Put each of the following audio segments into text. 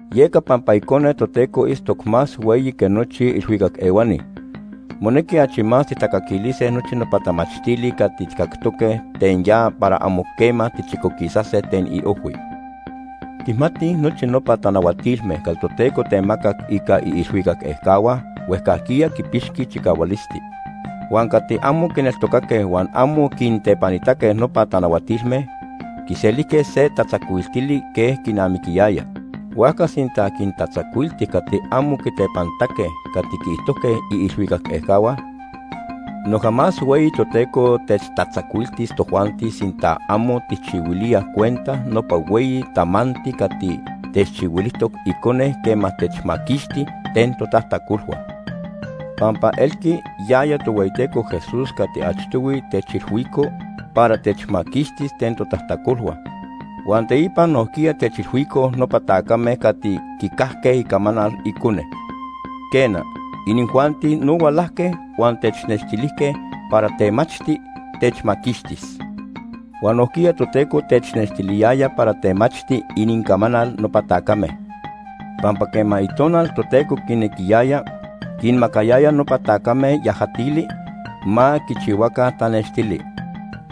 Yeca pampa Icone Toteco itztoc más hueyi que nochi ilhuicac ehuani, monequi achi más tijtacaquilise nochi nopa tamachtili cati tijcactoque ten ya para amo quema tichicoquisase ten iojhui. Tijmatij nochi nopa tanahuatilme cati Toteco temacac ica iilhuicac ejcahua huejcajquiya quipixqui chicahualisti. Huan cati amo quineltocaque huan amo quintepanitaque nopa tanahuatilme, quiselijque se tatzacuiltili quej quinamiquiyaya. Huajca sinta quintatzacuilti cati amo quitepanitaque cati quiijtojque iilhuicac ejcahua, noja más hueyi Toteco techtatzacuiltis tojuanti sinta amo tijchihuilíaj cuenta nopa hueyi tamanti cati techchihuilijtoc Icone quema techmaquixti ten totajtacolhua. Pampa elqui yaya Tohueyiteco Jesús cati achtohui techilhuico para techmaquixtis ten totajtacolhua, huan teipa nojquiya techilhuicoj nopa tacame cati quicajque icamanal Icone. Quena, inijuanti no hualajque huan technextilijque para temachti techmaquixtis. Huan nojquiya Toteco technextiliyaya para temachti inincamanal nopa tacame, pampa quema Itonal Toteco quinequiyaya, quinmacayaya nopa tacame yajatili ma quichihuaca tanextili,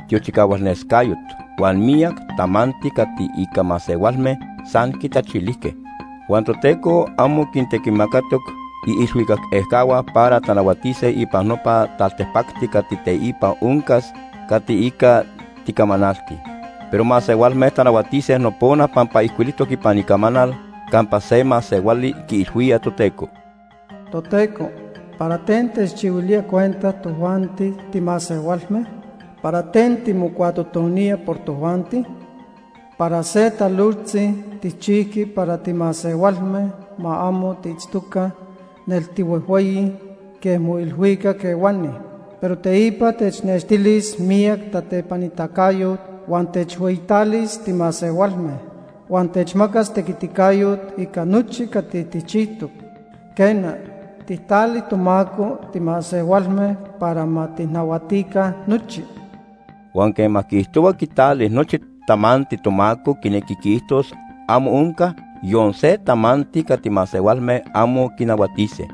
tiochicahualnescayot huan miyac tamanti cati ica masehualme san quintachilijque. Huan Toteco amo quintequimacatoc iilhuicac ejcahua para tanahuatise ipan nopa taltipacti cati teipa oncas cati ica ticamanaltij. Pero masehualme tanahuatise nopona pampa ijcuilijtoc ipan Icamanal campa se masehuali quiilhuía Toteco: “Toteco, ¿para ten techchihuilía cuenta tojuanti timasehualme? ¿Para ten timocuatotonía por tojuanti? Para se talojtzi tijchijqui para timasehualme ma amo tiitztoca nel tihuejhueyi quej moilhuicac ehuani. Pero teipa technextilis miyac tatepanitacayot huan techhueyitalis timasehualme. Huan techmacas tequiticayot ica nochi cati tijchijtoc. Quena, tijtali tomaco timasehualme para ma tijnahuatica nochi.” Huan quema quiijtohua quitali “nochi tamanti” tomaco quinequi quiijtos amo onca yon se tamanti cati masehualme amo quinahuatise.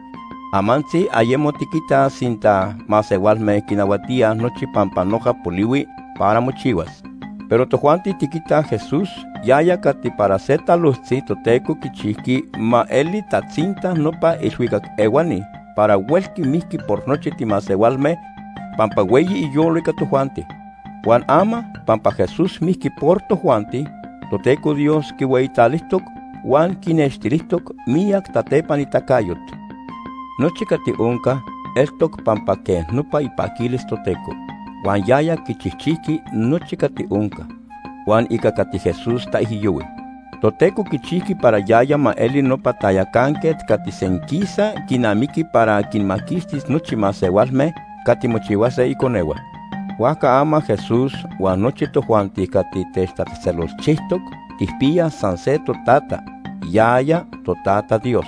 Amantzi ayemo tiquitaj sinta masehualme quinahuatíaj nochi pampa noja polihui para mochihuas. Pero tojuanti tiquitaj Jesús, yaya cati para se talojtzi Toteco quichijqui ma eli tatzinta nopa ilhuicac ehuani para huelqui mijqui por nochi timasehualme pampa hueyi iyolo ica tojuanti. Huan ama pampa Jesús mijqui por tojuanti, Toteco Dios quihueyitalijtoc huan quinextilijtoc miyac tatepanitacayot. Nochi cati onca, eltoc pampa quej nopa ipaquilis Toteco. Huan yaya quichijchijqui nochi cati onca. Huan ica cati Jesús taijyohui, Toteco quichijqui para yaya ma eli nopa tayacanquet cati senquisa quinamiqui para quinmaquixtis nochi masehualme cati mochihuase iconehua. Huajca ama Jesús huan nochi tojuanti cati techtatzejtzelolchijtoc tijpiyaj san se totata, yaya, toTata Dios.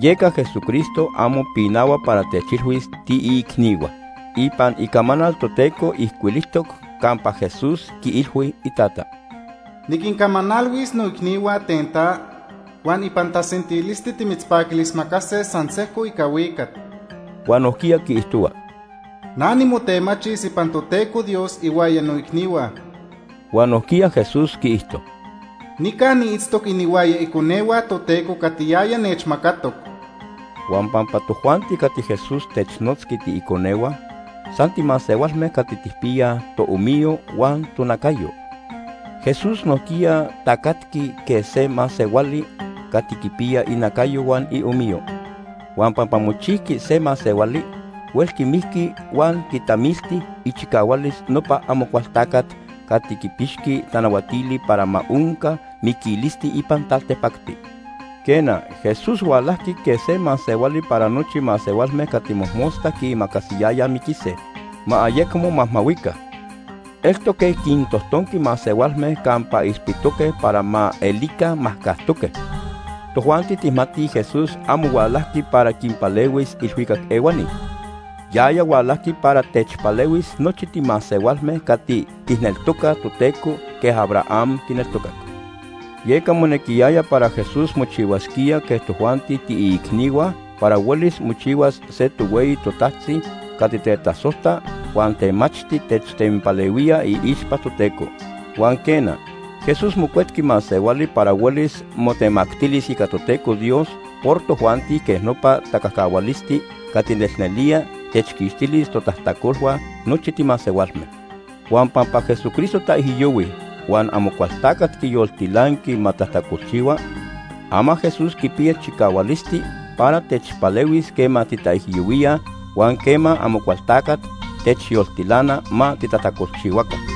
Yeca Jesucristo amo pinahua para techilhuis tiiicnihua. Ipan Icamanal Toteco ijcuilijtoc campa Jesús quiilhui iTata: “Niquincamanalhuis noicnihua ten ta, huan ipan tasentilisti timitzpaquilismacase san sejco ica huicat.” Huan nojquiya quiijtohua: “Na nimotemachis ipan Toteco Dios ihuaya noicnihua.” Huan nojquiya Jesús quiijto: “Nica niitztoc inihuaya iconehua Toteco cati yaya nechmacatoc.” Huan pampa tojuanti cati Jesús technotzqui “tiiconehua” san timasehualme cati tijpiyaj toomiyo huan tonacayo, Jesús nojquiya tacatqui quej se masehuali cati quipiya inacayo huan iomiyo. Huan pampa mochijqui se masehuali, huelqui mijqui huan quitamilti ichicahualis nopa Amocualtacat cati quipixqui tanahuatili para ma onca miquilisti ipan taltipacti. Quena, Jesús hualajqui quej se masehuali para nochi masehualme cati mojmosta quiimacasiyayaj miquise, ma ayecmo majmahuica. Eltoc quej quintojtonqui masehualme campa ilpitoque para ma elica majcajtoque. Tojuanti tijmatij Jesús amo hualajqui para quinpalehuis ilhuicac ehuani. Yaya hualajqui para techpalehuis nochi timasehualme cati tijneltocaj Toteco quej Abraham quineltocac. Yeca monequiyaya para Jesús mochihuasquía quej tojuanti tiiicnihua para huelis mochihuas se tohueyi totajtzi cati tetasojta huan temachti techtenpalehuía iixpa Toteco. Huan quena, Jesús mocuetqui masehuali para huelis motemactilis ica Toteco Dios por tojuanti quej nopa tacajcahualisti cati nelnelía techquixtilis totajtacolhua nochi timasehualme. Huan pampa Jesucristo taijyohui huan Amocualtacat quiyoltilanqui ma tajtacolchihua, ama Jesús quipiya chicahualisti para techpalehuis quema titaijyohuíaj huan quema Amocualtacat techyoltilana ma titajtacolchihuaca.